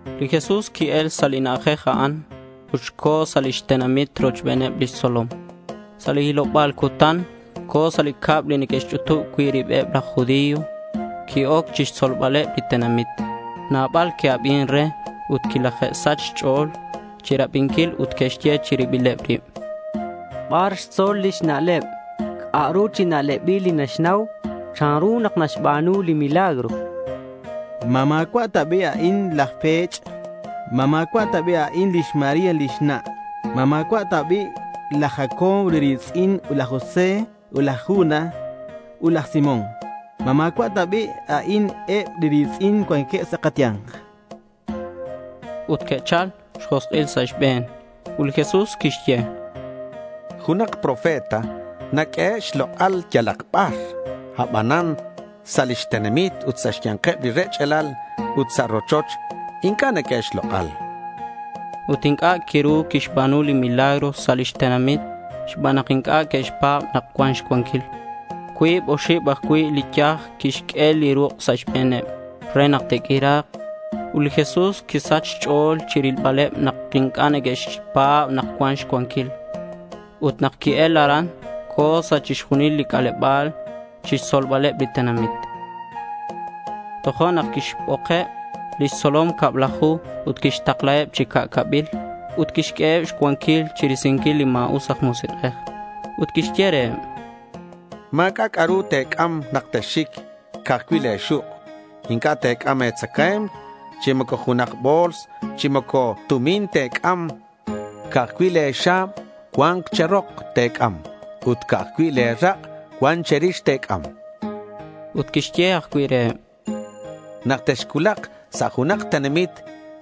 Li Jesús qui-el sa' li na'ajej a'an ut co̱ sa' lix tenamit rochbeneb lix tzolom. Sa' li hiloba̱l cutan co̱ sa' li cab li neque'xch'utub cui' ribeb laj judío. Qui-oc chixtzolbaleb li tenamit. Nabal que'abin re ut quilaje'sach xch'o̱l chirabinquil ut que'xye chi ribileb rib: —¿Bar xtzol lix na'leb? ¿C'a'ru chi na'lebil li naxnau? ¿Chanru nak naxba̱nu li milagro? chanqueb. —¿Ma ma̱cua' ta bi' a'in laj pech'? Ut ¿ma̱cua' ta bi' lix María lix na'? ¿Ma ma̱cua' ta bi' laj Jacobo li ri̱tz'in ut laj José, laj Judas ut laj Simón? ¿Ma ma̱cua' ta bi' a'in eb li ri̱tz'in li cuanqueb sa' kaya̱nk? chanqueb. Ut que'chal xjosk'il sa' xbe̱n. Ut li Jesús quixye: —Junak profeta naq'uehe' xlok'al yalak bar, abanan sa' lix tenamit ut sa' xya̱nkeb li rech'alal ut sa' rochoch inc'a' naq'uehe' xlok'al.— Ut inc'a' quiru quixba̱nu li milagro sa' lix tenamit xban nak inc'a' que'xpa̱b nak cuan xcuanquil. Cuib oxib ajcui' li yaj quixq'ue li ruk' sa' xbe̱neb re nak te'q'uira̱k. Ut li Jesús quisach xch'o̱l chirilbaleb nak inc'a' neque'xpa̱b nak cuan xcuanquil. Ut nak qui-el aran, co̱ sa' chixjunil li c'aleba̱l chixtzolbaleb li tenamit. Tojo'nak quixbokeb lix tzolom cablaju ut quixtaklaheb chi ca'cabil ut quixq'ueheb xcuanquil chirisinquil li ma̱us aj musik'ej. Ut quixye reheb: —Ma̱c'a' c'a'ru te̱c'am nak texxic, ca'aj cui' le̱ xuk'. Inc'a' te̱c'am e̱tzacae̱mk, chi moco junak bo̱ls, chi moco tumin te̱c'am. Ca'aj cui' le̱ xa̱b cuan che̱rok te̱c'am ut ca'aj cui' le̱ rak' cuan che̱rix te̱c'am. Ut quixye ajcui' reheb: —Nak texcuulak sa' junak tenamit,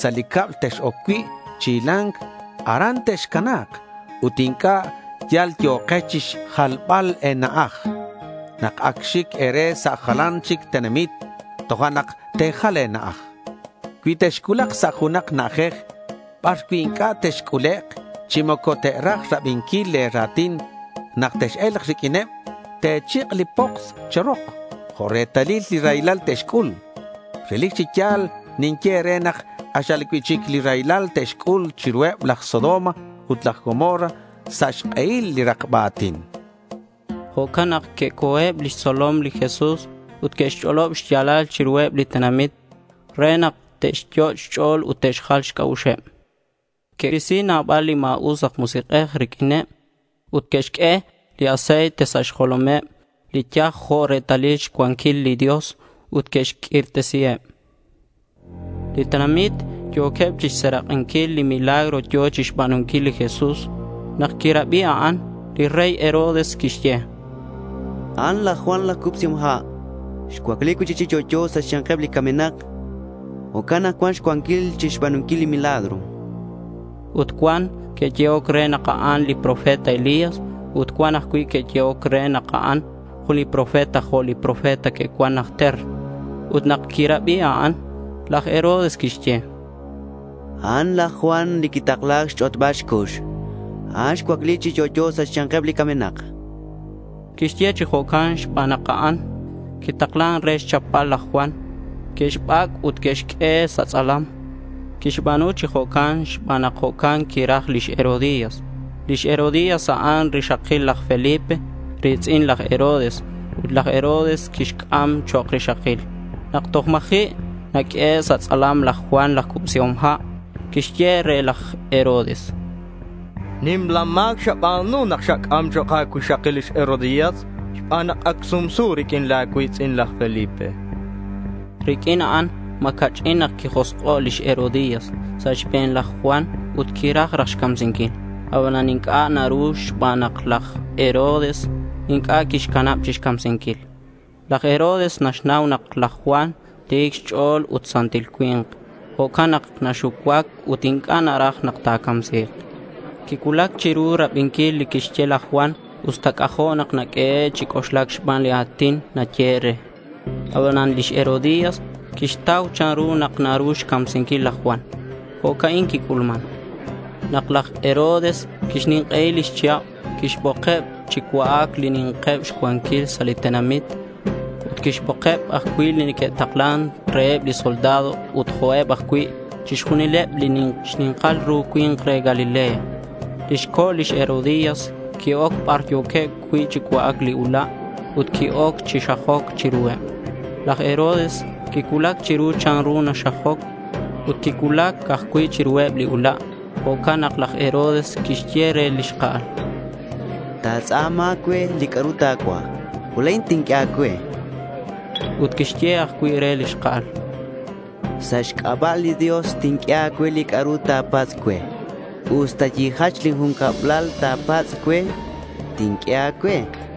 sa' li cab tex-oc cui' chi hila̱nc, aran texcana̱k ut inc'a' yal yo̱kex chixjalbal e̱na'aj. Nak ac xic e̱re sa' jalan chic tenamit, tojo'nak te̱jal le̱ na'aj. Cui texcuulak sa' junak na'ajej bar cui' inc'a' texc'ulek' chi moco te'raj rabinquil le̱ ra̱tin, nak tex-e̱lk riq'uineb te̱chik' li poks che̱rok jo' retalil li raylal te'xc'ul. Relic chi ya̱l ninye e̱re nak k'axal cui'chic li raylal te'xc'ul chiruheb laj Sodoma ut laj Gomorra sa' xk'ehil li rakba a̱tin, chan. Jo'can nak que'co̱eb lix tzolom li Jesús ut que'xch'olob xya̱lal chiruheb li tenamit re nak te'xyot' xch'o̱l ut te'xjal xc'a'uxeb. Que'risi nabal li ma̱us aj musik'ej riq'uineb ut que'xq'ue li aceite sa' xjolomeb li yaj jo' retalil xcuanquil li Dios ut que'xq'uirtesiheb. Li tenamit yo̱queb chixserak'inquil li milagro yo̱ chixba̱nunquil li Jesús. Nak quirabi a'an, li rey Herodes quixye: —A'an laj Juan laj Cubsihom Ha'. Xcuacli cui'chic chi yo'yo sa' xya̱nkeb li camenak. Jo'can nak cuan xcuanquil chixba̱nunquil li milagro, chan. Ut cuan que'yehoc re nak a'an li profeta Elías. Ut cuan ajcui' que'yehoc re nak a'an jun li profeta jo' li profeta que'cuan najter. Ut nak quirabi a'an, laj Herodes quixye: —A'an laj Juan li quintakla xch'otbal xcux. A'an xcuacli chi yo'yo sa' xya̱nkeb li camenak, chan. Quixye chi jo'can xban nak a'an quitaklan re xchapbal laj Juan. Que'xbac' ut que'xq'ue sa' tz'alam. Quixba̱nu chi jo'can xban nak jo'can quiraj lix Herodías. Lix Herodías a'an rixakil laj Felipe, ri̱tz'in laj Herodes ut laj Herodes quixc'am chok' rixakil. Nak toj ma̱ji' naq'uehe' sa' tz'alam, laj Juan laj Cubsihom Ha' quixye re laj Herodes: —Nimla ma̱c xaba̱nu nak xac'am chok' a̱cuixakil lix Herodías xban nak ac sumsu riq'uin la̱ cui̱tz'in, laj Felipe, chan re. Riq'uin a'an ma̱ ca'ch'in nak quijosk'o' lix Herodías sa' xbe̱n laj Juan ut quiraj raj xcamsinquil. Abanan inc'a' naru xban nak laj Herodes inc'a' quixcanab chixcamsinquil. Laj Herodes naxnau nak laj Juan ti̱c xch'o̱l ut santil cui̱nk. Jo'can nak naxucuac ut inc'a' naraj nak ta̱camsi̱k. Quicuulac chiru rabinquil li quixye laj Juan usta c'ajo' nak naq'uehe' chi c'oxlac xban li a̱tin nayehe' re. Abanan lix Herodías quixtau chanru nak naru xcamsinquil laj Juan. Jo'ca'in quic'ulman. Nak laj Herodes quixnink'ei lix chihab, quixbokeb chi cua'ac li ni̱nkeb xcuanquil sa' li tenamit, ut quixbokeb ajcui' li neque'taklan reheb li soldado ut jo'can ajcui' chixjunileb li xni̱nkal ru cui̱nk re Galilea. Lix co' lix Herodías qui-oc bar yo̱queb cui' chi cua'ac li ula' ut qui-oc chi xajoc chiruheb. Laj Herodes quicuulac chiru chanru naxajoc. Ut quicuulac ajcui' chiruheb li ula'. Jo'can nak laj Herodes quixye re li xka'al: —Ta̱tz'a̱ma cue li c'a'ru ta̱cuaj ut la̱in tinq'ue a̱cue, chan. Ut quixye ajcui' re li xka'al: —Sa' xc'aba' li Dios, tinq'ue a̱cue li c'a'ru ta̱patz' cue. Usta yijach lin jun cablal ta̱patz' cue, tinq'ue a̱cue, chan.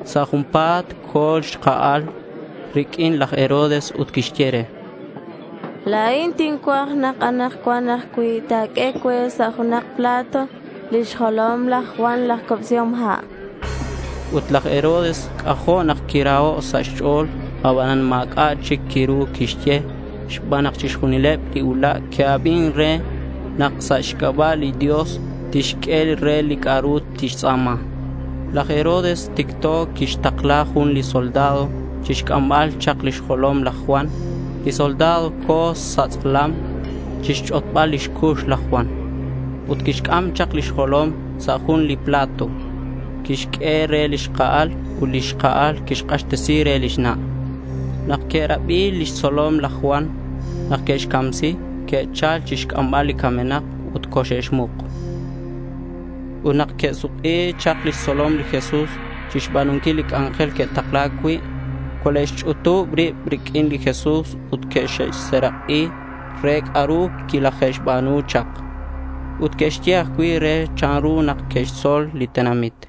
Sa' junpa̱t co̱ li xka'al riq'uin laj Herodes ut quixye re: —La̱in tincuaj nak anakcuan ajcui' ta̱q'ue cue sa' junak plato lix jolom laj Juan laj Cubsihom Ha', chan. Ut laj Herodes c'ajo' nak quiraho' sa' xch'o̱l. Abanan ma̱c'a' chic quiru quixye xban nak chixjunileb li ula' que'abin re nak quixye sa' xc'aba' li Dios tixq'ue re li c'a'ru tixtz'a̱ma. Laj Herodes ticto quixtakla jun li soldado chixc'ambal chak lix jolom laj Juan. Li soldado co̱ sa' tz'alam chixch'otbal lix cux laj Juan. Ut quixc'am chak lix jolom sa' jun li plato. Quixq'ue re li xka'al ut li xka'al quixk'axtesi re lix na'. Nak que'rabi lix tzolom laj Juan nak que'xcamsi, que'chal chixc'ambal li camenak ut coxe'xmuk. Ut nak que'suk'i chak lix tzolom li Jesús chixba̱nunquil li c'anjel que'takla̱c cui', cole'xch'utub rib riq'uin li Jesús ut que'xserak'i re c'a'ru quilaje'xba̱nu chak. Ut que'xye ajcui' re chanru nak que'xtzol li tenamit.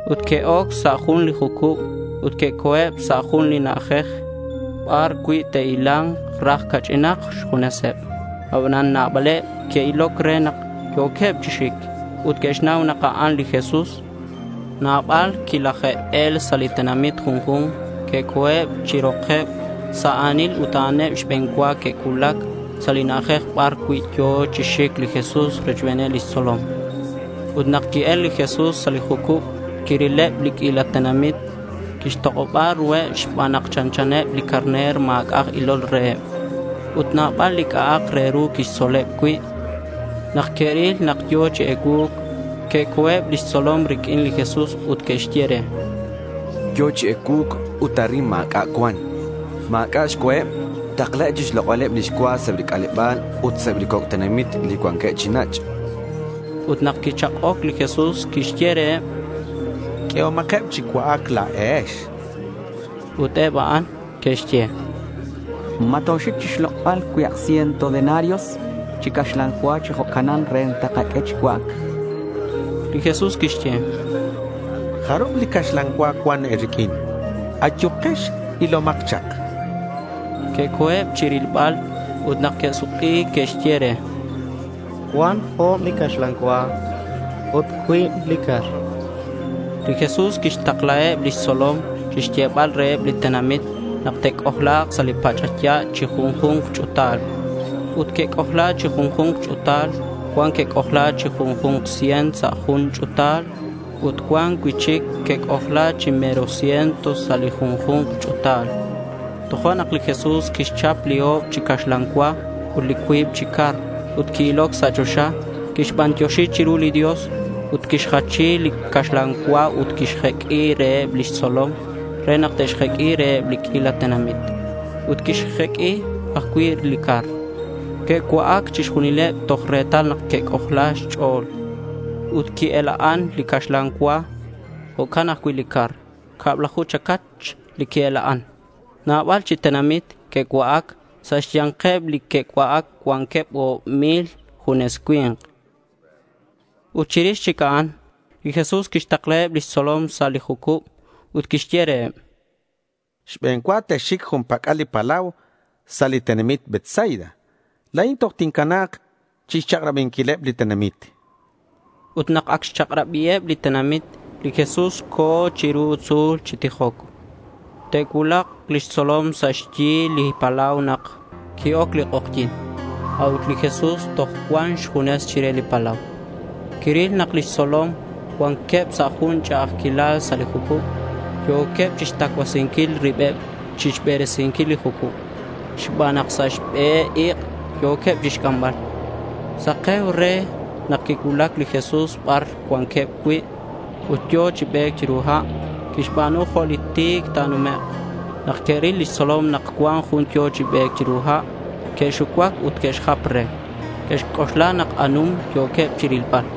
Ut que'oc sa' jun li jucub ut que'co̱eb sa' jun na'ajej bar cui' te'hila̱nk raj ca'ch'inak xjuneseb. Abanan nabaleb que'iloc re nak yo̱queb chi xic ut que'xnau nak a'an li Jesús. Nabal quilaje'el sa' li tenamit junju̱nk. Que'co̱eb chi rokeb sa' a̱nil ut a'aneb xbe̱n cua que'cuulac sa' li na'ajej bar yo̱ cui' chi xic li Jesús rochbeneb lix tzolom. Ut nak qui-el li Jesús sa' li jucub, quirileb li q'uila tenamit. Quixtok'oba ruheb xban nak chanchaneb li carner ma̱c'a' aj ilol reheb. Ut nabal li c'a'ak re ru quixtzoleb cui'. Nak que'ril nak yo̱ chi ecuu̱c, que'co̱eb lix tzolom riq'uin li Jesús ut que'xye re: —Yo̱ chi ecuu̱c ut arin ma̱c'a' cuan. Ma̱c'a' xcuaheb. Taklaheb chixlok'baleb lix cua sa' eb li c'aleba̱l ut sa' eb li coc' tenamit li cuanqueb chi nach', chanqueb. Ut nak quichak'oc li Jesús quixye reheb: —Q'uehomakeb chi cua'ac la̱ex.— Ut eb a'an que'xye: —¿Ma toxic chixlok'bal cuibak ciento denarios chi caxlan cua chi jo'canan re te'kaq'ue chi cua'ac? chanqueb. Li Jesús quixye: —¿Jarub li caxlan cua cuan e̱riq'uin? Ayukex, ilomak chak.— Que'co̱eb chi rilbal ut nak que'suk'i que'xye re: —Cuan o̱b li caxlan cua ut cuib li car, chanqueb. Li Jesús quixtaklaheb lix tzolom chixyebal reheb li tenamit nak te'c'ojla̱k sa' li pach'aya' chi junju̱nk ch'u̱tal. Ut que'c'ojla chi junju̱nk ch'u̱tal. Cuan que'c'ojla chi jun ciento sa' ju̱nk ch'u̱tal ut cuan cui'chic que'c'ojla chi mero ciento sa' li junju̱nk ch'u̱tal. Tojo'nak li Jesús quixchap li o̱b chi caxlan cua ut li cuib chi car ut qui-iloc sa' choxa. Quixbantioxi chiru li Dios. Ut quixjachi li caxlan cua ut quixq'ue reheb lix tzolom re nak te'xjeq'ui reheb li q'uila tenamit. Ut que'xjeq'ui ajcui' li car. Que'cua'ac chixjunileb toj retal que'c'ojla xch'o̱l. Ut qui-ela'an li caxlan cua. Jo'can ajcui' li car. Cablaju chacach li qui-ela'an. Nabal chi tenamit que'cua'ac. Sa' xya̱nkeb li que'cua'ac cuanqueb o̱b mil junes cui̱nk. Ut chirix chic a'an, li Jesús quixtaklaheb lix tzolom sa' li jucub ut quixye reheb: —Xbe̱n cua texxic jun pac'al li palau sa' li tenamit Betsaida. La̱in toj tincana̱k chixchak'rabinquileb li tenamit, chan reheb. Ut nak ac xchak'rabiheb li tenamit, li Jesús co̱ chiru tzu̱l chi tijoc. Te'cuulak lix tzolom sa' xyi li palau nak qui-oc li k'ojyi̱n, a'ut li Jesús toj cuan xjunes chire li palau. Quiril nak lix tzolom cuanqueb sa' jun ch'a'ajquilal sa' li jucub. Yo̱queb chixtacuasinquil ribeb chixberesinquil li jucub xban nak sa' xbe ik' yo̱queb chixc'ambal. Sake̱uc re nak quicuulac li Jesús bar cuanqueb cui' ut yo̱ chi be̱c chiru ha'. Quixba̱nu jo' li ti̱c ta̱numek'. Nak que'ril lix tzolom nak cuan jun yo̱ chi be̱c chiru ha', que'xucuac ut que'xjap re. Que'xc'oxla nak anum yo̱queb chirilbal.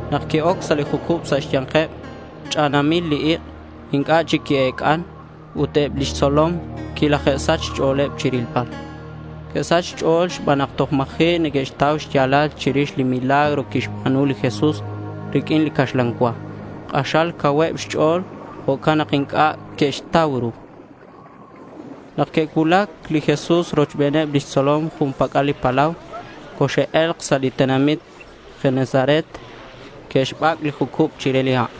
Nak qui-oc sa' li jucub sa' xya̱nkeb, ch'anamil li ik'. Inc'a' chic qui-ec'an. Ut eb lix tzolom quilaje'sach xch'o̱l chirilbal. Que'sach xch'o̱l xban nak toj ma̱ji' neque'xtau xya̱lal chirix li milagro quixba̱nu li Jesús riq'uin li caxlan cua. K'axal cauheb xch'o̱l. Jo'can nak inc'a' que'xtau ru. Nak que'cuulac li Jesús rochbeneb lix tzolom jun pac'al li palau, coxe'e̱lk sa' li tenamit Genesaret. Que'xbac' li jucub chire li ha'.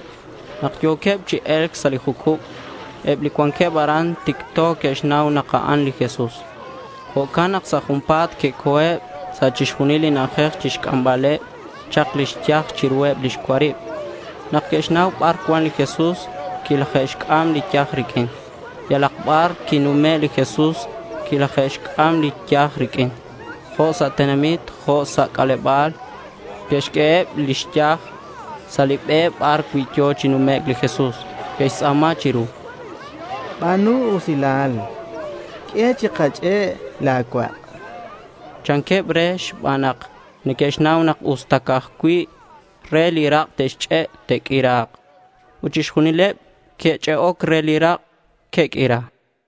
Nak yo̱queb chi e̱lc sa' li jucub, eb li cuanqueb aran ticto que'xnau nak a'an li Jesús. Jo'can nak sa' junpa̱t que'co̱eb sa' chixjunil li na'ajej chixc'ambaleb chak lix yaj chiruheb lix cuarib. Nak que'xnau bar cuan li Jesús, quilaje'xc'am li yaj riq'uin. Yalak bar quinume' li Jesús quilaje'xc'am li yaj riq'uin, jo' sa' tenamit, jo' sa' c'aleba̱l. Que'xq'ueheb li yaj sa' li be bar cui' yo̱ chi numec' li Jesús. Que'xtz'a̱ma chiru: —Ba̱nu usilal, q'ue chikach'e' la̱ cuak', chanqueb re xban nak neque'xnau nak usta ca'aj cui' re li rak' te'xch'e', te'q'uira̱k. Ut chixjunileb li que'ch'e'oc re li rak', que'q'uira.